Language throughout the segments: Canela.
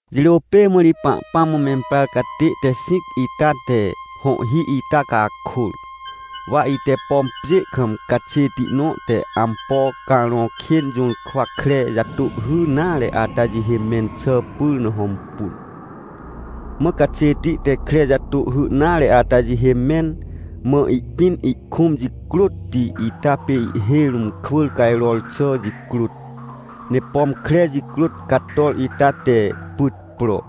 Jirô pê mã ri Pahpãm mã memprar catê te xĩc ita te hõhhi ita cakôr. Wa ite, pom pjê kam caxêti nõ te ampo carõ kên jũrkwa kre jatôhhy nare ata jihê mẽn xà pyr na hõmpun. Mã caxêti te kre jatôhhy nare ata jihê mẽn, mã ihpĩn ihkũm jicrôtti ita pê ihhêj rũm kwỳr cajror xà jicrôt, ne pom kre jicrôt cator ita te pyt pro,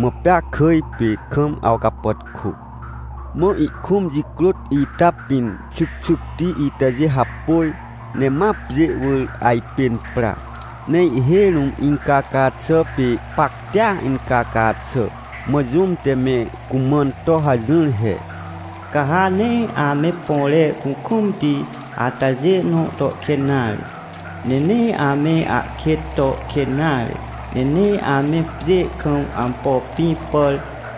mã pea kỳj pê kam awcapàtkô. Mã ihkũm jicrôt ita pĩn xycxycti itajê hapôj, ne ma pjê wỳr ajpên pra, ne ihhêj rũm incaca xà pê pactia incaca xà. Mã jũm te me cumãn to hajỹr he: — Ca ha nee ame põre kukũmti atajê nõ to kên nare, ne nee ame ahkêt to kên nare, ne nee ame pjê kam ampo pĩ pàr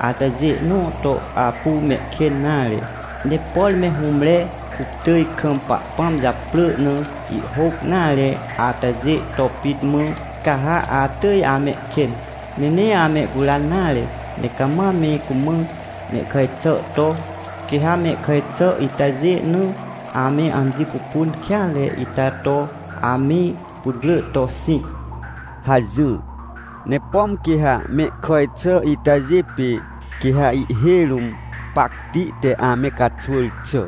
atajê nõ to apu mehkên nare. Ne por me hũmre kuctỳj kam Pahpãm japrỳ na ihhôc nare atajê to pit mã, ca ha atỳj amehkên. Ne nee amehcuran nare, ne cama me cumã mehkàj xà to, quê ha mehkàj xà itajê na ame amji pupun kêanre ita to ame putwrỳ to xĩc — hajỹr. Ne pom quê ha mehkàj xà itajê pê, quê ha ihhêj rũm pacti te ame caxwỳr xà.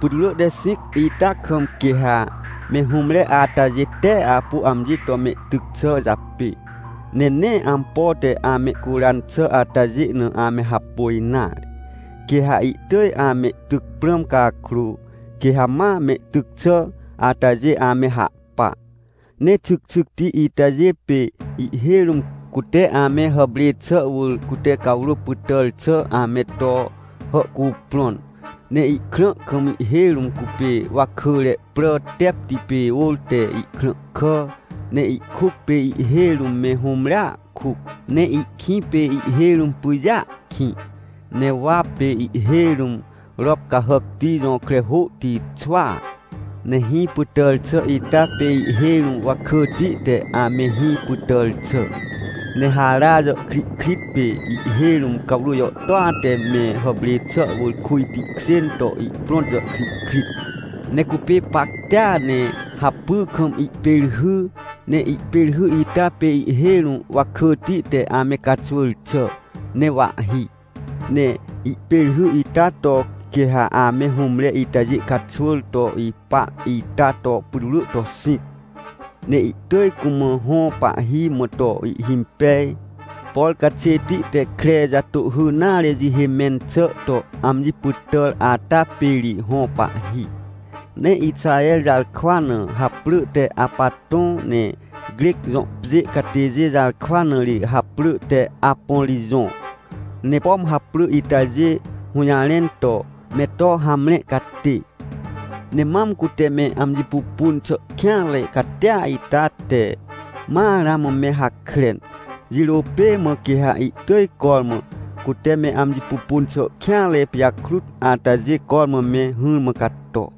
Putwrỳ te xĩc ita kam, quê ha me hũmre atajê tee apu amji to mehtyc xà japê, ne nee ampo te amehcuran xà atajê na ame hapôj nare. Quê ha ihtỳj amehtyc prãm cakrô, quê ha ma mehtyc xà atajê ame hahpa. Ne xycxycti itajê pê ihhêj rũm cute ame hàprê xà wỳr cute cawrô pytàr xà ame to hàhcuprõn. Ne ihkrã kam ihhêj rũm cupê wakỳre prà tepti pê ôr te ihkrãhkà, ne ihkuc pê ihhêj rũm me hũmrea kuc. Ne ihkĩ pê ihhêj rũm pyjêa kĩ. Ne wa pê ihhêj rũm rop cahàcti jõkre hôhti xwaa. Ne hĩ pytàr xà ita pê ihhêj rũm wakỳti te ame hĩ pytàr xà. Ne hara jàhkrihkrit pê ihhêj rũm cawrô jàhtôa te me hàprê xà wỳr kujti kjên to ihprõt jàhkrihkrit. Ne cupê pactia ne hapy kam ihpêrhy, ne ihpêrhy ita pê ihhêj rũm wakỳti te ame caxwỳr xà, ne wahhi. Ne ihpêrhy ita to quê ha ame hũmre itajê caxwỳr to ipa ita to putwrỳ to xĩc. Ne ihtỳj cumã hõ pahhi mã to ihhimpej, por caxêti te kre jatôhhy nare jihê mẽn xà to amji pytàr ata pê ri hõ pahhi. Ne Ixaher jarkwa na haprỳ te Apatõ ne Crec jõ pjê catêjê jarkwa na ri haprỳ te Apôrijõ ne, pom haprỳ itajê hũjarẽn to “Me to hamre catê”. Ne mam cute me amji pupun xà kêanre catia ita te ma ramã me hakren. Jirô pê mã, quê ha ihtỳj cormã cute me amji pupun xà kêanre pijakrut atajê cormã me hỹrmã cato.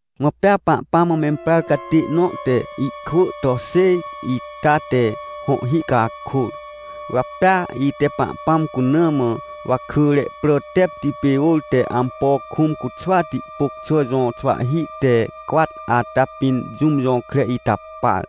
Mã pea Pahpãm mã memprar catê nõ te ihkwỳ to xêj ita te hõhhi cakôr. Wa pea ite Pahpãm cuna mã wakỳre prà tepti pê ôr te ampo kũm cuxwati pôc xà jõ xwahhi te cwat ata pĩn jũm jõkre ita par.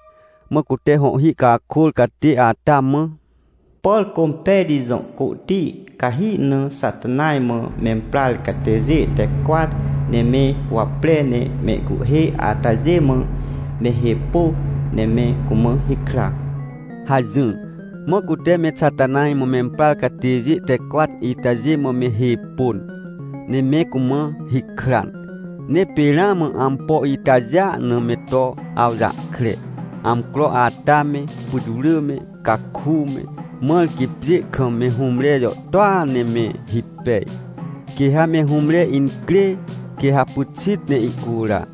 Mã cute hõhhi cakôr catê ata mã: — Por Cômpejti jõ côhti cahi na Xatanaj mã memprar catêjê te cwat ne me huwapre ne mehcuhhê atajê mã me hê pô, ne me cumã hikra — hajỹr. Mã cute me Xatanaj mã memprar catêjê te cwat itajê mã me hê pôn, ne me cumã hikran. Ne pê ramã ampo itajêa na me to awjahkre, amcro ata me, putwrỳ me, caku me, mãr quê pjê kam me hũmre jàhtôa ne me hipej. Quê ha me hũmre incrê, quê ha pyxit ne ihcura.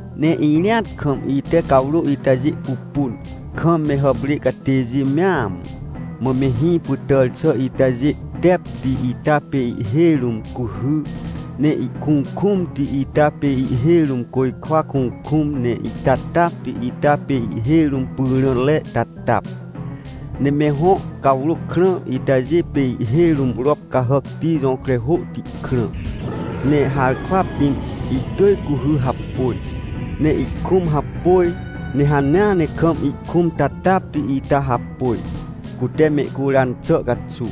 Ne irĩat kam ite cawrô itajê pupun, kam me hàprê catêjê mea mã, mã me hĩ pytàr xà itajê tepti ita pê ihhêj rũm cuhy, ne ihkukũmti ita pê ihhêj rũm côjkwa kukũm, ne ihtatapti ita pê ihhêj rũm pyrãre tatap. Ne me hõ cawrô krã itajê pê ihhêj rũm rop cahàcti jõkre hôhti krã, ne harkwa pĩn ihtỳj cuhy hapôj. Ne ihkũm hapôj ne hanea ne kam ihkũm tatapti ita hapôj, cute mehcuran xà caxuw.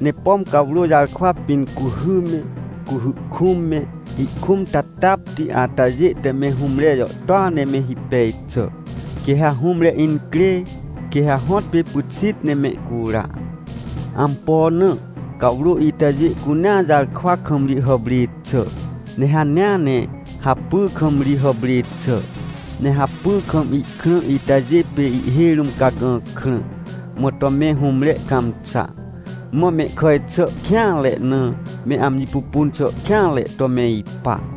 Ne pom cawrô jarkwa pĩn cuhy me, cuhy kũm me, ihkũm tatapti atajê te me hũmre jàhtôa ne me hipej xà. Quê ha hũmre incrê, quê ha hõtpê pyxit ne mehcura. Ampo na? Cawrô itajê cunea jarkwa kam ri hàprê xà, ne hanea ne hapy kam ri hàprê xà. Ne hapy kam ihkrã itajê pê ihhêj rũm cagã krã, mã to me hũmre cãmxa, mã mehkàj xà kêanre na, me amji pupun xà kêanre to me ipa.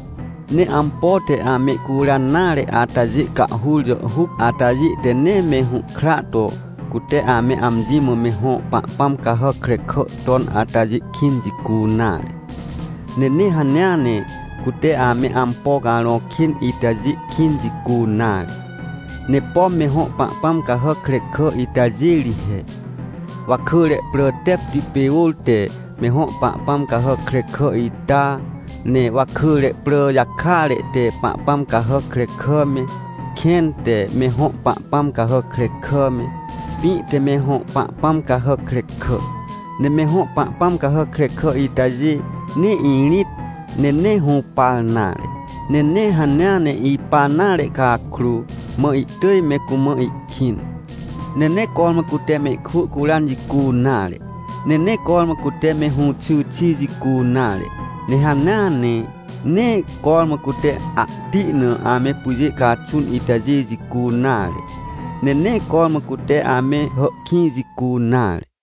Ne ampo te amehcuran nare atajê cahhur jàhhuc atajê te nee me hũhkra to cute ame amji mã me hõ pahpãm cahàc krekà ton atajê kĩn jicu nare. Ne nee hanea ne cute ame ampo carõ kên itajê kĩn jicu nare, ne pom me hõ pahpãm cahàc krekà itajê ri he: Wakỳre prà tepti pê ôr te me hõ pahpãm cahàc krekà ita, ne wakỳre prà jakare te pahpãm cahàc krekà me, kẽn te me hõ pahpãm cahàc krekà me, pĩ te me hõ pahpãm cahàc krekà. Ne me hõ pahpãm cahàc krekà itajê nee irĩt, ne nee hũpar nare, ne nee hanea ne ipa nare cakrô, mã ihtỳj me cumã ihkĩn. Ne nee cormã cute mehkwỳ curan jicu nare, ne nee cormã cute me hũxy xi jicu nare. Ne hanea ne nee cormã cute ahti na ame pyjê caxun itajê jicu nare, ne nee cormã cute ame hàhkĩj jicu nare.